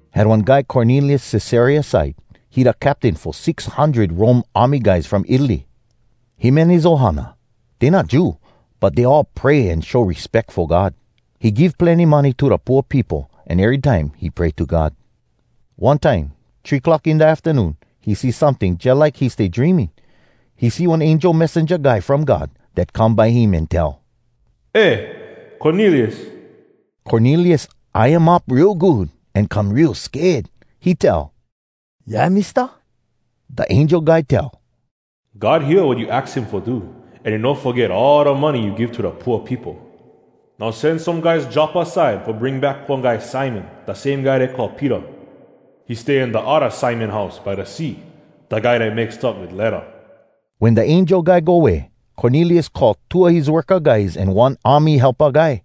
Had one guy Cornelius Cesarea side. He da captain fo six hundred Rome army guys from Italy. Him an his ohana, dey not Jew, but dey all pray an show respeck fo God. He give plenny money to da pooa peopo, an erytime he pray to God. One time, three clock in da aftanoon, he see someting jalike he stay dreaming. He see one angel messenja guy from God dat come by him an tell, “Eh, Cornelius!” Cornelius eye um up real good an come real sked. He tell, “Yeah, Mista?” Da angel guy tell, “God hear wat you aks him fo do, an he no foget all da money you give to da pooa peopo. Now send some guys Joppa side fo bring back one guy Simon, da same guy dey call Peter. He stay in da odda Simon house by da sea, da guy dat make stuff wit ledda.” Wen da angel guy go way, Cornelius call two a his worka guys an one army helpa guy.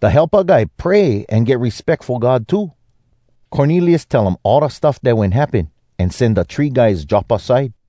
Da helpa guy pray an get respeck fo God too. Cornelius tell um all da stuff dat wen happen, an send da three guys Joppa side.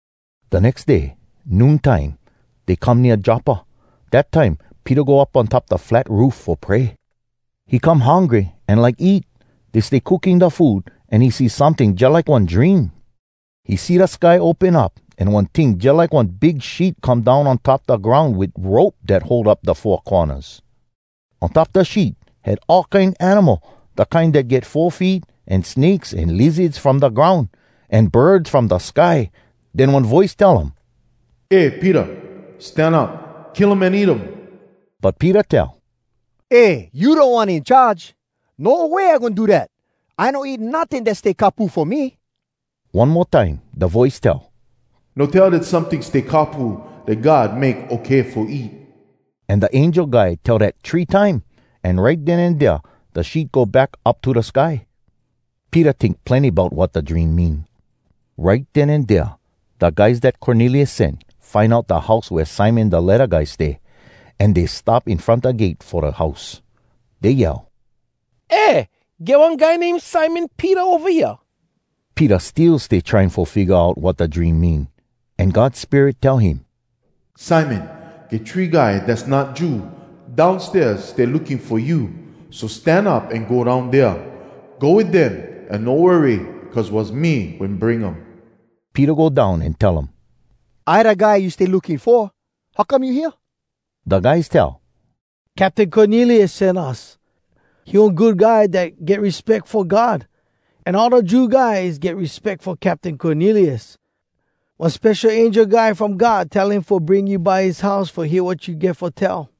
Da nex day, noon time, dey come nea Joppa. Dat time Peter go up on top da flat roof fo pray. He come hungry an like eat. Dey stay cooking da food, an he see someting jalike one dream. He see da sky open up, an one ting jalike one big sheet come down on top da groun wit rope dat hold up da four cornas. On top da sheet had all kine animal, da kine dat get four feet, an snakes an lizards from da groun, an birds from da sky. Den one voice tell um, “Eh Peter! Stan up! Kill um an eat um!” But Peter tell, “Eh, you Da One In Charge! No way I goin do dat! I no eat notting dat stay kapu fo me!” One mo time da voice tell, “No tell dat someting stay kapu dat God make okay fo eat!” An da angel guy tell dat three time, an right den an dea da sheet go back up to da sky. Peter tink plenny bout wat da dream mean. Right den an dea da guys dat Cornelius send find out da house wea Simon da ledda guy stay. An dey stop in front da gate fo da house. Dey yell, “Eh, get one guy name Simon Peter ova hea?” Peter still stay trying fo figga out wat da dream mean, an God Spirit tell him, “Simon, get three guy dass not Jew, downstairs stay looking fo you. So stan up an go down dea. Go wit dem an no worry cuz was me wen bring um.” Peter go down an tell um, “I da guy you stay looking fo. How come you hea?” Da guys tell, “Captain Cornelius sen us. He one good guy dat get respeck fo God, an all da Jew guys get respeck fo Captain Cornelius. One spesho angel guy from God tell him fo bring you by his house fo hear wat you get fo tell.”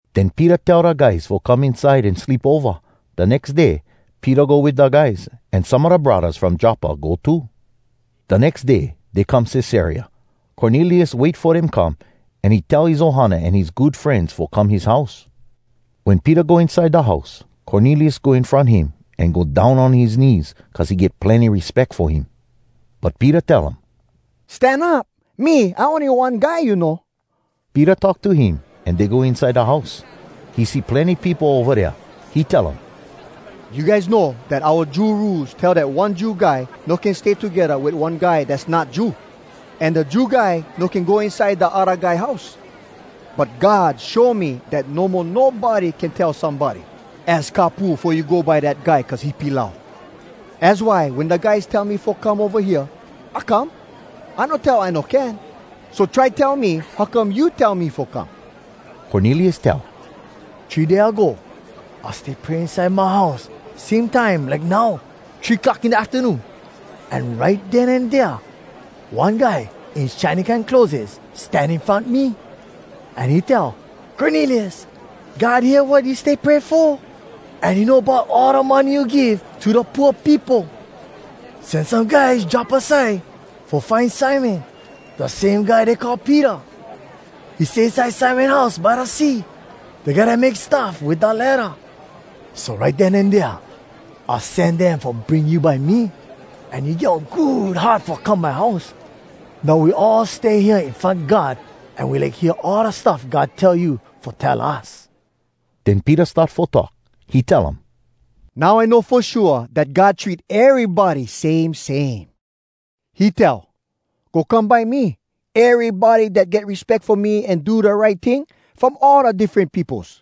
Den Peter tell da guys fo come inside an sleep ova. Da nex day Peter go wit da guys, an some a da braddahs from Joppa go too. Da nex day dey come Cesarea. Cornelius wait fo dem come, an he tell his ohana an his good frenz fo come his house. Wen Peter go inside da house, Cornelius go in front him, an go down on his knees, cuz he get plenny respeck fo him. But Peter tell um, “Stan up. Me, I ony one guy you know.” Peter talk to him an dey go inside da house. He see plenny peopo ova dea. He tell um, “You guys know dat oua Jew Rules tell dat one Jew guy no can stay togedda wit one guy dass not Jew. An da Jew guy no can go inside da odda guy house. But God show me dat no mo nobody can tell somebody, ‘Az kapu fo you go by dat guy cuz he pilau.’ Az why wen da guys tell me fo come ova hea, I come. I no tell I no can. So try tell me how come you tell me fo come.” Cornelius tell, “Three day ago, I stay pray inside my house, same time like now, three clock in da aftanoon. An right den an dea one guy in shiny kine clotheses stan in front me. An he tell, ‘Cornelius, God hear wat you stay pray fo, an he know bout all da money you give to da pooa peopo. Send some guys Joppa side fo find Simon, da same guy dey call Peter. He stay inside Simon house by da sea, da guy dat make stuff wit da ledda.’ So right den an dea, I send dem fo bring you by me. An you get one good heart fo come my house. Now we all stay hea in front God, an we like hear all da stuff God tell you fo tell us.” Den Peter start fo talk. He tell um, “Now I know fo shua dat God treat erybody same same. He tell, ‘Go come by me, erybody dat get respeck fo me an do da right ting, from all da diffren peopos.’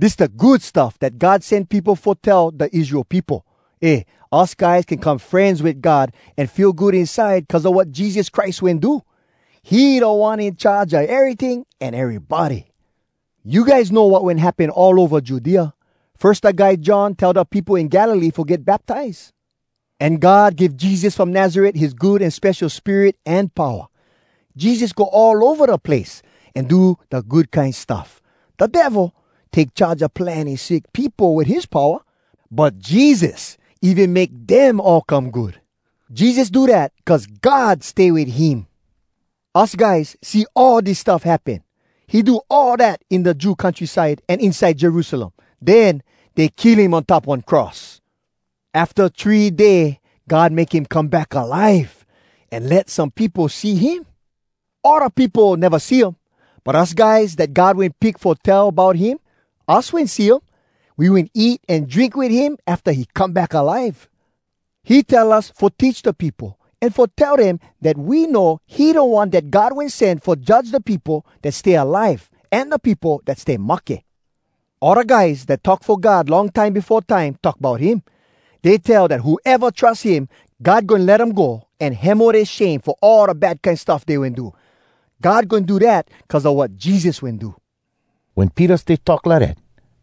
Dis da Good Stuff dat God send peopo fo tell da Israel peopo: ‘Eh! Us guys can come frenz wit God an feel good inside cuz a wat Jesus Christ wen do. He Da One In Charge a eryting an erybody.’ You guys know wat wen happen all ova Judea. Firs da guy John tell da peopo in Galilee fo get baptize. An God give Jesus from Nazaret his Good An Spesho Spirit an powa. Jesus go all ova da place, an do da good kine stuff. Da Devil take charge a plenny sick peopo wit his powa, but Jesus even make dem all come good. Jesus do dat cuz God stay wit him. Us guys see all dis stuff happen. He do all dat in da Jew countryside an inside Jerusalem. Den dey kill him on top one cross. Afta three day God make him come back alive, an let some peopo see him. All da peopo neva see um, but us guys dat God wen pick fo tell bout him, us wen see um. We wen eat an drink wit him afta he come back alive. He tell us fo teach da peopo an fo tell dem dat we know he da One dat God Wen Send fo judge da peopo dat stay alive an da peopo dat stay mahke. All da guys dat talk fo God long time befo time talk bout him. Dey tell dat whoeva trus him, God goin let um go an hemo dea shame fo all da bad kine stuff dey wen do. God goin do dat cuz a wat Jesus wen do.” Wen Peter stay talk lidat,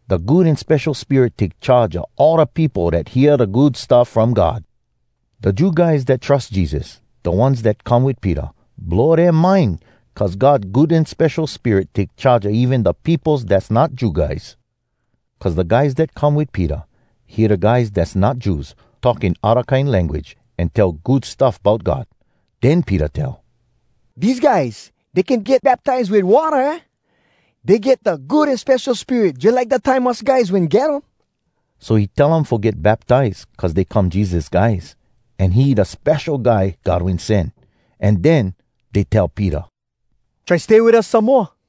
da Good An Spesho Spirit take charge a all da peopo dat hear da Good Stuff From God. Da Jew guys dat trus Jesus, da ones dat come wit Peter, blow dea mind cuz God Good An Spesho Spirit take charge a even da peopos dass not Jew guys. Cuz da guys dat come wit Peter hear da guys dass not Jews talk in odda kine language an tell good stuff bout God. Den Peter tell, “Dese guys, dey can get baptize wit watta, aah? Dey get da Good An Spesho Spirit jalike da time us guys wen get um.” So he tell um fo get baptize cuz dey come Jesus guys, an he da Spesho Guy God Wen Send. An den dey tell Peter, “Try stay wit us some moa!”